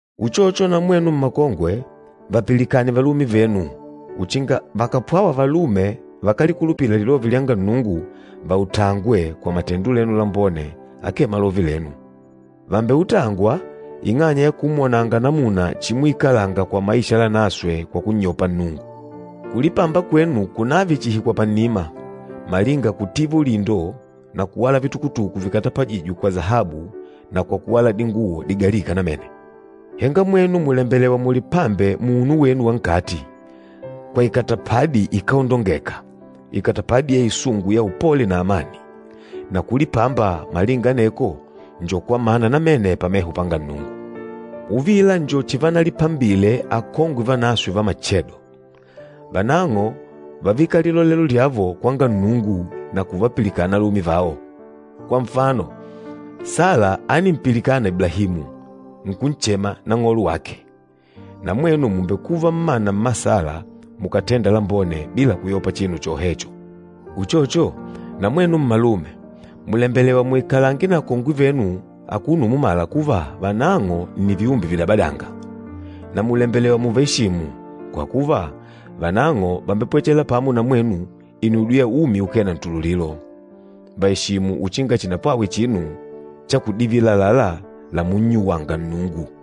Uchocho na mwenu mmakongwe, vapilikane valume venu uchinga vakàpwawa valume vakálikulupila lilove lyanga Nnungu vautangwe kwa matendo lenu lambone akee malove lenu. Vàmbeutangwa, ing'anya ya kumwonanga namuna chimuikalanga kwa maisha lanaswe kwa kunnyopa Nnungu. Kulipamba kwenu kunave chihi kwa pannima, malinga kutiva ulindo na kuwala vitukutuku vikatapajîjwe kwa sahabu na kwa kuwala dinguwo digalîka namene. Henga mwenu mùlembelewa mulipambe muunu wenu wa nkati, kwa ikatapadi ikáondongeka, ikatapadi ya isungu ya upole na amani. Na kulipamba malinga aneko njo kwa mana namene pameho panga Nnungu. Uvila njo chivanalipambile akongwe vanaswe va machedo, vanang'o vávika lilolelo lyavo kwanga Nnungu na kuvapilikana alume vao. Kwa nfano, Sala ánimpilikana Iblahimu, nkunchema nang'olo wake. Na mwenu mùmbekuva mmana mma Sala mukàtenda lambone bila kuyopa chinu chohecho. Uchocho, na mwenu mmalume, mùlembelewa muikalange na akongwe venu akuno umumala kuva vanang'o nni viumbe vidabadânga. Na mùlembelewa mùvaeshimu, kwa kuva vanang'o vàmbepwechela pamo na mwenu inudyo ya umi ukee na ntululilo. Vàeshimu uchinga chinapwawe chinu chakudivila àlalá lamunnyuwanga Nnungu.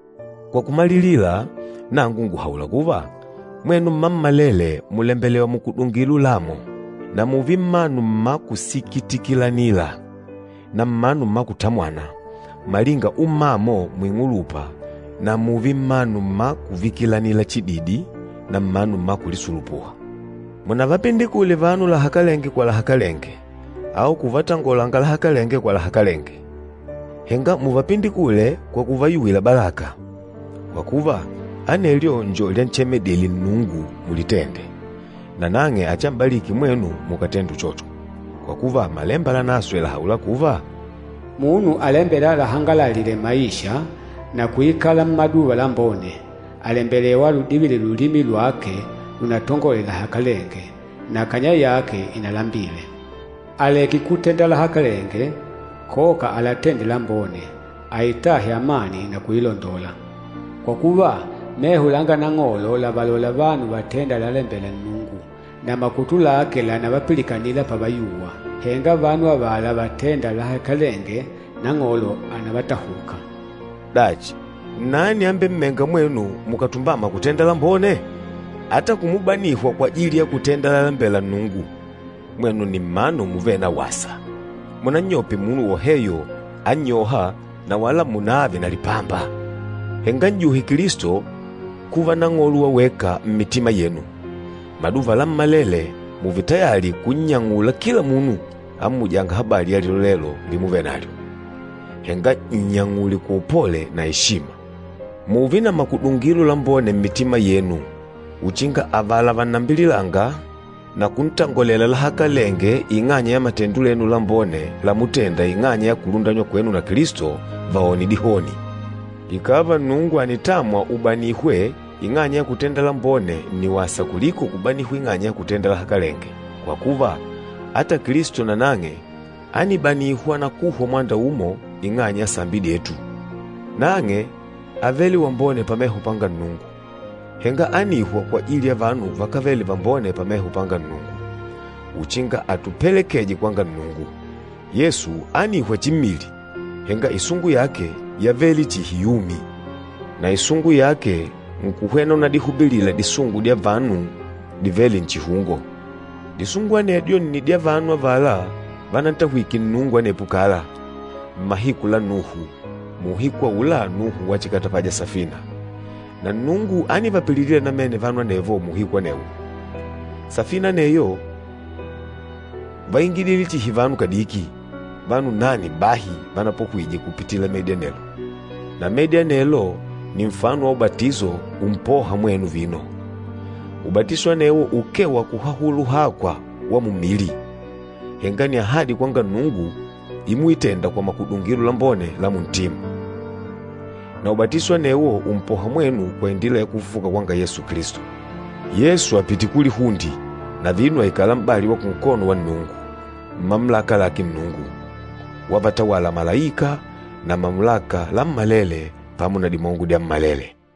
Kwa kumalilila, nangu ngùhaula kuva, mwenu mmammalele mùlembelewa mukudungile ulamo, na mùùve mmanu mma kusikitikilanila na mmanu mma kutamwana, malinga ummamo muing'ulupa na mùùve mmanu mma kuvikilanila chididi na mmanu mma kulisulupuha. Munavapindikule vanu lahakalenge kwa lahakalenge au kuvatangolanga lahakalenge kwa lahakalenge, henga muvapindikule kwa kuvayuwila balaka. Kwa kuva, anelyo njo lyanchemeledile Nnungu mulitende, nanang'e achiam'baliki mwenu mukàtenda uchocho. Kwa kuva, Malemba Lanaswe làhaula kuva, “Munu alembêla alahangalalile maisha, na kuikala mmaduva lambone, àlembelewa aludivile lulimi lwake lunatangole lahakalenge, na kanya yake inalambile. Aleke kutenda lahakalenge, koka alatende lambone, aitahe amani na kuilondola. Kwa kuva, meho langa Nang'olo lavalola vanu vatênda lalalembela Nnungu, na makutu lake lànavapilikanila pavayuwa. Henga vanu avala vatênda lahakalenge Nang'olo ànavatahuka.” Dachi, nnani ambemmênga mwenu mukàtumbama kutenda lambone? Ata kumubanihwa kwajili ya kutenda lalalembela Nnungu, mwenu nni mmanu muvêle na wasa. Munannyope munu woheyo annyôha na wala munààve na lipamba. Henga n'juhe Kilisto kuva Nang'olo wa weka mmitima yenu. Maduva lammalele mùùve tayali kunnyang'ula kila munu ammujânga habali ya lilolelo limuvenalyo, henga nnyang'ule kwa upole na eshima. Mùùve na makudungilo lambone mmitima yenu uchinga avala vannambililânga na kuntangolela lahakalenge ing'anya ya matendo lenu lambone lamutenda ing'anya ya kulundanywa kwenu na Kilisto, vaone dihoni. Ikàva Nnungu ànitamwa ubanihwe ing'anya ya kutenda lambone nni wasa kuliko kubanihwa ing'anya ya kutenda lahakalenge, kwa kuva, ata Kilisto nanang'e ánibanihwa na kuhwa mwanda umo ing'anya ya sambi dyetu. Nang'e ávele wambone pameho panga Nnungu, henga ánihwa kwajili ya vanu vakávele vambone pameho panga Nnungu, uchinga atupelekeje kwanga Nnungu. Yesu ánihwa chimmili, henga isungu yake yávele chihi yumi. Na isungu yake nkuhwena unadihubilila disungu dya vanu divêle nchihungo. Disungu anedyo nni dya vanu avala vanantahwike Nnungu anepo kala, mmahiku la Nuhu, muuhiku aula Nuhu wachikatapaja safina, na Nnungu ánivapililila namene vanu anevo muuhiku anewo. Safina aneyo váingidile chihi vanu kadiki, vanu nane bahi vanapohwije kupitila medi anelo. Na medi anelo nni nfano wa ubatiso umpôha mwenu vino. Ubatiso anewo ukee wa kuhahula uhakwa wa mummili, henga nni ahadi kwanga Nnungu imuitenda kwa makudungilo lambone la muntima. Na ubatiso anewo ùmpoha mwenu kwa indila ya kufufuka kwanga Yesu Kilisto. Yesu àpite kulihunde na vino àikala m'bali wa kunkono wa Nnungu, mmamulaka lake Nnungu, wavatawala malaika na mamulaka lammalele pamo na dimongo dyammalele.